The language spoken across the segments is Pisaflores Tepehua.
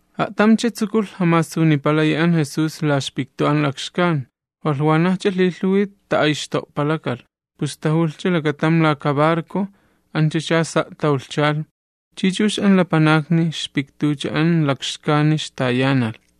A'tamcha tsukulh jamasunipalayi an Jesús la ixpiktu an lakxkan, walh wanajcha lhilhuwi ta'ayxto'palakalh pus tajulhcha lakatam laka barco anchacha sa' tawlhchalh chi chux an lapanakni ixpiktucha an lakxkani ixtayanalh.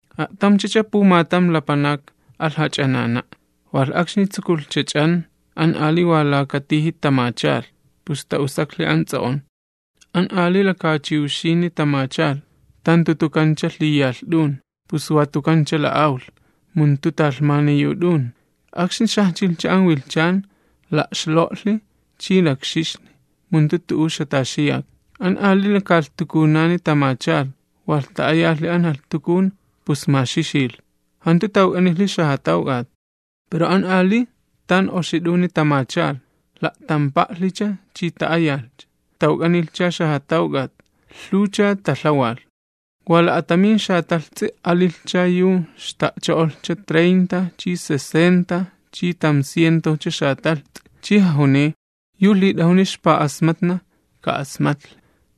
―A'tamchacha pumatam lapanak alh jach'anana'. Walh akxni tsukulhcha ch'an, an ali wa laka tiji tamachalh, pus ta'usaklhi an ts'o'on. An ali laka chiwxini tamachalh, tan tutukancha lhiyalh t'un, pus wa tukancha la'awlh, mu jantu talhmani yu t'un. Akxni xajchilhcha an wilhchan, la'xlo'lhi chi lakxixli, mu jantu tu'u ixjataxiyak. An ali lakalhtukunani tamachalh, walh ta'ayalhi an jalhtukun, pus maxixilh, jantu tawk'anilhi xajatawk'at. Pero an ali tan oxi t'uni tamachalh, la'tampa'lhicha chi ta'ayalhcha. Tawk'anilhcha xajatawk'at, lhuwcha talhawalh. Wa la'atamin xatalhts'i alilhcha yu xta'cho'olhcha treinta chi sesenta chi tamcientojcha xatalhts'i. Chi jajuniy: ―Yu lhit'ajuni ixpa'asmatna ka'asmatlhi.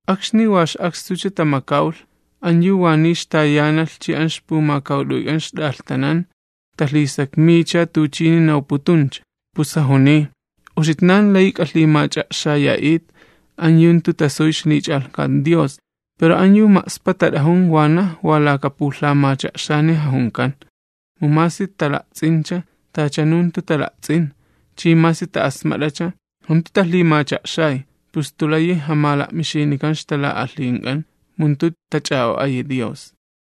Akxni wa ix'akstucha tamakawlh, an yu wa niy ixtayanalh chi an ixpumakawt'uyk'an ixt'alhtanan talhisakmiycha tuchini nawputuncha. Pus jajuniy: ―Uxitnan layi k'alhimach'a'xaya'it an yu jantu tasuy ixlich'alhkat Dios, pero an yu ma'spa tat'ajun wanaj wa laka pulhamacha'xani jajunkan, mu masi tajalakawanan, tachanu jantu tajalakawan chi masi taja'asmatnan tachanu jantu taja'asmatnan, pus jantu layi jamala'mixinikan ixtala'alhink'an mu jantu tach'a'o'ayi Dios.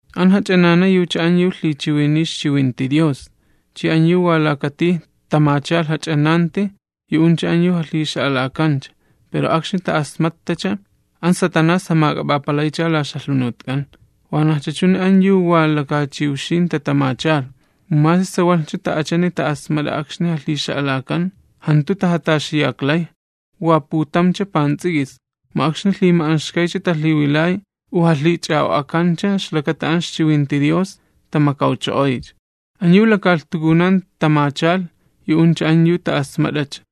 An jach'anana yucha an yu lhichiwiniy ixchiwinti Dios, chi an yu wa laka tij tamachalh jach'ananti yu'uncha an yu jalhixa'alakancha, pero akxni ta'asmattacha, an Satanás jamak'ap'apalaycha la ixjalhunutk'an. Wanajcha chuni an yu wa laka chiwxin tatamachalh, mu masi sawalhcha ta'achani ta'asmat'a akxni jalhixa'alakan, jantu tajataxiyaklay, wa putamcha pants'ik'is, mu akxni lhima'anxkaycha talhiwilay u jalhich'a'o'akancha ixlakata an ixchiwinti Dios, tamakawcho'oycha. An yu lakalhtukunan tamachalh, yu'uncha an yu ta'asmat'acha,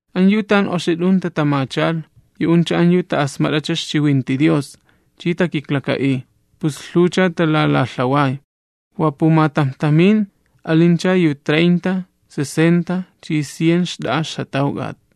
An yu tan oxi t'un tatamachalh, yu'uncha an yu ta'asmat'acha ixchiwinti Dios chi takiklaka'iy, pus lhuwcha talalalhaway, wa pumatamjtamin, alincha yu treinta, sesenta chi cien xt'a'a ixjatawk'at.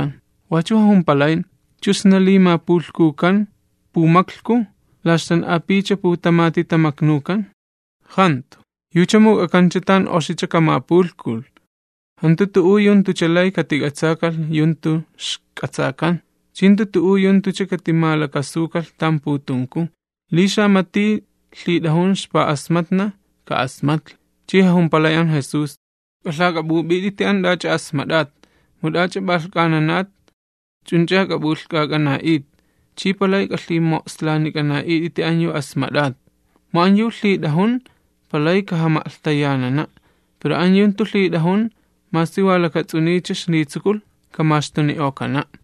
Wachu jajumpalay: ―¿Chu sna li makilhnukan pumaklhku, a't'alh'ulakancha laka cajón u la ixtan'apuwcha putamati tamaknukan? ¡Jantu! Yucha muk'akancha tan oxicha kamapulhkulh. Jantu tu'u yu jantucha lay katik'atsakalh yu jantu ixk'atsakan, chi jantu tu'u yu jantucha katimalakasukalh tan putunku. Li xamati lhit'ajun ixpa'asmatna, ka'asmatlhi. Chi jajumpalay an Jesús: ―K'alhak'ap'up'it'iti an t'ach'a asmat'at, mu t'ani p'alhk'ananatcha, wach'u ch'uni k'ap'ulhk'ak'ana'it, ch'i p'alay k'alhimo'slanik'ana'it'iti uxitnan yu asmat'atcha. Mu an yu lhit'ajun palay kajama'lhtayanana', pero an yu jantu lhit'ajun, masi wa k'ischa kaxlitsukulh kamaxtuni'okana'.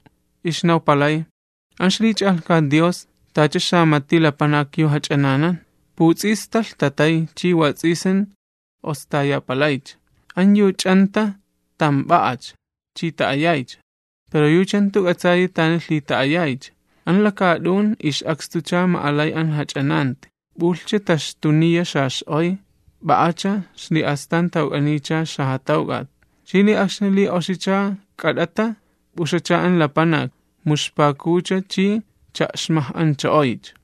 Ixnawpalay: ―An ixlich'alhkat Dios tacha xamati lapanak yu jach'ananan. Puts'ista lhtatay chi wats'isin ostayapalaycha. An yu ch'anta tamp'a'acha chi ta'ayaycha, pero yucha jantu k'atsayi tani lhita'ayaycha. An lakaat'un ix'akstucha ma'alay an jach'ananti, p'ulhnajcha taxtuniya xax'oy, p'a'acha xli'astan tawk'aniycha xajatawk'at. Chi li akxni li oxicha k'at'ata, p'uxacha an lapanak, mu ixpakucha chi cha'xmaj'ancho'oycha.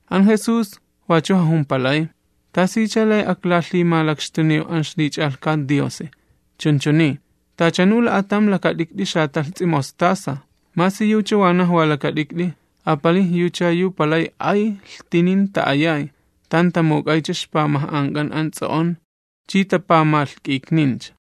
An Jesús wachu jajumpalay: ―¿Tasicha lay aklalhimalakxtuniw an ixlich'alhkat Diosi? Chunchuni: Tachanu la'atam lakat'ikt'i xatalhts'i mostaza, masi yucha wanaj wa lakat'ikt'i, apalij yucha yu palay ay lhtinin ta'ayay, tan tamuk'aycha ixpamaj'ank'an an ts'o'on chi tapamalhk'iknincha.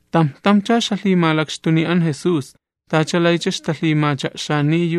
Tamj tamjcha ixjajuniy pulhamacha'xan an Jesús, tacha lay ixtalhimacha'xaniy.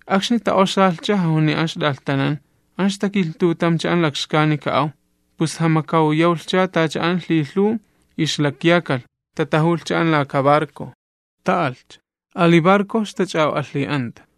Akxni tats'isilhcha jajuniy an ixt'alhtanan: ―An ixtakilhtutamcha an lakxkani ka'aw. Pus jamakawyawlhcha tacha an lhilhuw ixlakyakalh, tatajulhcha an laka barco, ta'alhcha. Ali barco ixtach'a'o'alhi'anta.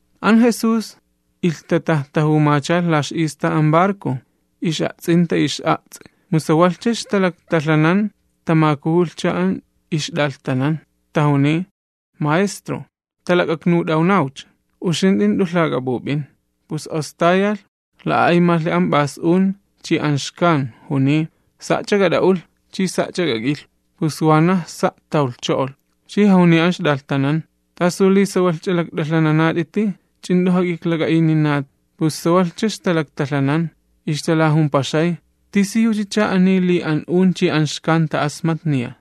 An Jesús ilhtatajtajumachalh la ix'istaj an barco, ix'a'ts'inta ix'a'ts'i. Mu sawalhcha ixtalaktalhanani an ixt'alhtanan tamakujulhcha, tajuniy: ―Maestro, talak'aknut'awnawcha uxint'i jant'u lhak'ap'up'in. Pus ostayalh, la'a'aymalhi an p'as un, chi an alamalh, juniy: ―Sa'ch'a k'at'a'ulh chi sa'ch'a k'ak'ilhu. Pus wanaj sa' tawlhcho'olh. Chi jajuniy an ixt'alhtanan: ―¿T'asu li sawalhch'a lakt'alhananat'iti, ch'u jant'u jak'iklak'a'ininat? Pus sawalhcha ixtalaktalhanan, ixtalajumpaxay: ―¿Tisiyuchacha ani, li an un chi an xkan ta'asmatniya?